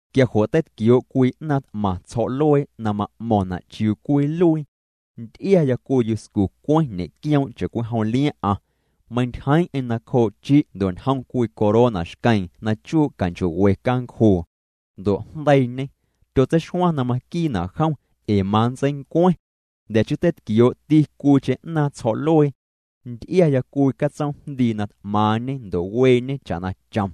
Quia jo' teitquioo' cwii 'naaⁿ t'maⁿ tsjo̱'luee na ma'mo̱ⁿna' chiuu cwinluii. Nty'iaya cwii yuscu cweⁿ ñe'quioom' cha'cwijom liaⁿ'aⁿ. Meintyjeeⁿ'eⁿ nacjoo' chi' ndo' ñjom cwii corona xqueeⁿ na chuu' canchoo'we cancjuu. Ndo' jndeiiñê. Tyotseixuaⁿ na maquiina' jom, ee manntseincueⁿ. Jnda̱ chii teitquioo'ti cwiicheⁿ 'naaⁿ tsjo̱'luee. Nty'iaya cwii catsoomjndii na t'maaⁿñe ndo' weeñe cha'na chom.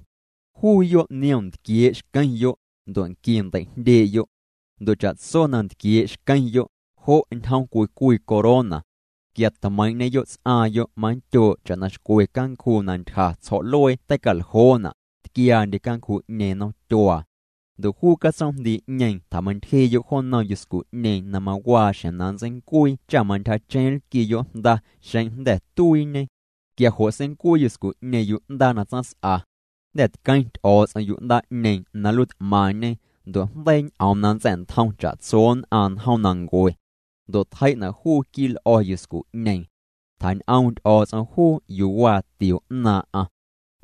Juuyo' niom ntquiee' xqueⁿyo', ndo' nqui ndei'jndyee'yo'. Ndo' cha'tso na ntquiee' xqueⁿyo', jo' ñjom cwii cwii corona. Quia tmeiiⁿ'ñeyo' ts'aaⁿyo' manndyoo' cha'na xcwe cancjuu na ntyja tsjo̱'luee tei'caljoona', tquiaandye cancjuu'ñeeⁿ nomtyuaa. Ndo' juu catsoomjndii'ñeeⁿ tjameintyjee'yo' jo nnom yuscu'ñeeⁿ na mawaa xjeⁿ na nntseincuii cha mantyjacheⁿ nlquiiyo' jnda xeⁿ jnda̱ tuiiñe. Quia jo' seincuii yuscu'ñeeⁿ yu'ndaa na tsaⁿs'a. Jnda̱ tqueⁿ Ty'o̱o̱ts'om yu'ndaa'ñeeⁿ na nluiit'maⁿñe, ndo' jndeii ñ'oom na nntsa̱'ntjom cha'tso nn'aⁿ njoomnancue. Ndo' tjei'na' juu quii'l'o̱ yuscu'ñeeⁿ. Tjañ'oom Ty'o̱o̱ts'om juu yuu waa tio 'naaⁿ'aⁿ.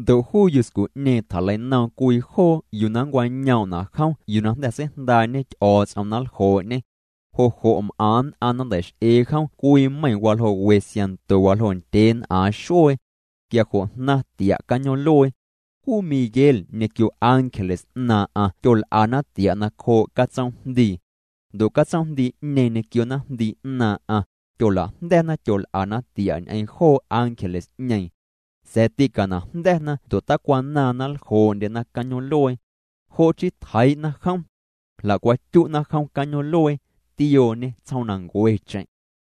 Ndo' juu yuscu'ñeeⁿ tjaleinoom cwii joo yuu na nncwañoom'na' juu yuu na jnda̱ seijndaa'ñe Ty'o̱o̱ts'om na nljoo'ñê. Jo' jo' m'aⁿ nn'aⁿ na nnteix'eena jom cwii meiⁿ waljoo' we siaⁿnto waljoo' ndyeen'aaⁿ xuee. Quia jo' jnaⁿ tia' cañoom'luee. Juu Miguel ñequio ángeles 'naaⁿ'aⁿ tyol'ana tia' nacjoo' catsoomjndii. Ndo' catsoomjndii'ñeeⁿ ñequio naⁿjndii 'naaⁿ'aⁿ tyola'jnda̱na, tyol'ana tia' ñ'eⁿ joo ángeles'ñeeⁿ. Sa̱a̱ tîcanajnda̱na ndo' tacwanaaⁿ na nljoo'ndyena cañoom'luee. Jo' chii tjeii'na jom. Jla'cwatyu'na jom cañoom'luee, tiooñê tsjoomnancuecheⁿ.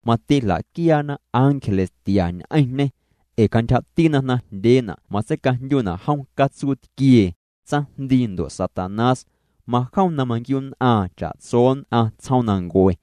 Mati jla'quiaana ángeles tia ñ'eⁿñê. Ee cantyjati na jnaⁿjndyeena' matseicajndyuna' jom catsuu tquiee, tsaⁿjndii ndo' Satanás. Majom na manquiu'nn'aaⁿ cha'tso nn'aⁿ tsjoomnancue.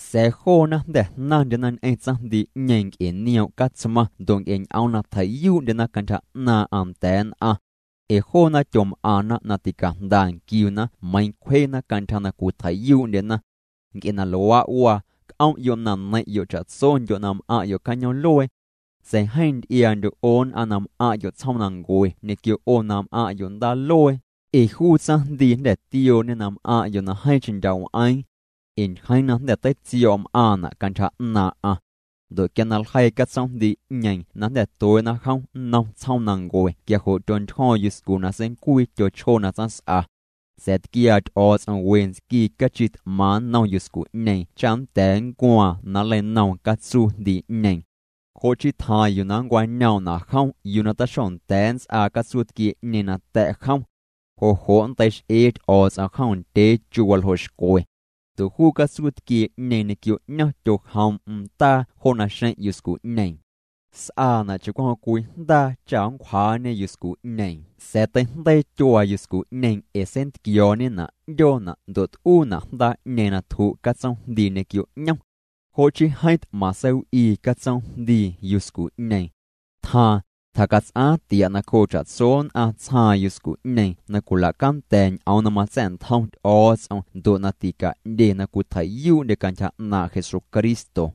Sa̱a̱ joona jnda̱ jnaⁿndyena ñ'eⁿ tsaⁿjndii'ñeeⁿ nc'e nioom' Catsmaⁿ ndo' nc'e ñ'oom na tjei'yuu'ndyena cantyja 'naaⁿ'aⁿ nda̱a̱ nn'aⁿ. Ee joona tyom'aⁿna na ticajnda nquiuna meiiⁿ cwjena cantyja na cwitjei'yuu'ndyena. Nc'e na luaa' waa, c'om'yo' na neiⁿ'yo' cha'tsondyo' na m'aⁿ'yo' cañoom'luee. Sa̱a̱ jeeⁿ nty'iaa'ndyo' 'o nn'aⁿ na m'aⁿ'yo' tsjoomnancue ñequio 'o na m'aⁿ'yo' ndaaluee, ee juu tsaⁿjndii jnda̱ tiooñê na m'aⁿ'yo' na jeeⁿcheⁿ ndya' w'eeⁿ. Ee ntyjeeⁿ na jnda̱ teitsio̱o̱' m'aaⁿna' cantyja 'naaⁿ'aⁿ. Ndo' quia na ljeii catsoomjndii'ñeeⁿ na jnda̱ tuee'na jom nnom tsjoomnancue quia jo' tyontyjo̱o̱ⁿ yuscu na seincuii tyochjoo na tsaⁿs'a. Sa̱a̱ tquiaa Ty'o̱o̱ts'om we ntsquii cachi t'maaⁿ nnom yuscu'ñeeⁿ cha nnda̱a̱ nncuaaⁿ na nleinoom catsuujndii'ñeeⁿ. Jo' chii tjaaⁿ yuu na nncwañoom'na' jom yuu na taxonda̱a̱ nnts'aa catsuu tquiee'ñeeⁿ nata̱' jom. Jo' jo' nntei'x'ee Ty'o̱o̱ts'om jom ndyee chu waljoo' xcwe. Ndo' juu catsuu tquiee'ñeeⁿ ñequio 'ñom tyojoom'm ndaa jo naxeⁿ' yuscu'ñeeⁿ. S'aana' cha'jom cwii jndaa, cha nncjaawjaañe yuscu'ñeeⁿ. Sa̱a̱ teijndeii tyuaa yuscu'ñeeⁿ ee seintquiooñena' 'ndyoona' ndo' t'uuna' jndaa'ñeeⁿ na tju' catsoomjndii ñequio 'ñom. Jo' chii jeeⁿ t'maⁿ seiw'ii catsoomjndii yuscu'ñeeⁿ. Tjaaⁿ, tjacats'aaⁿ tia' nacjoo cha'tso nn'aⁿ tsjaaⁿ yuscu'ñeeⁿ na cwila'canda̱ ñ'oom na matsa̱'ntjom Ty'o̱o̱ts'om ndo' na tica'ndye na cwitjei'yuu'ndye cantyja 'naaⁿ' Jesucristo.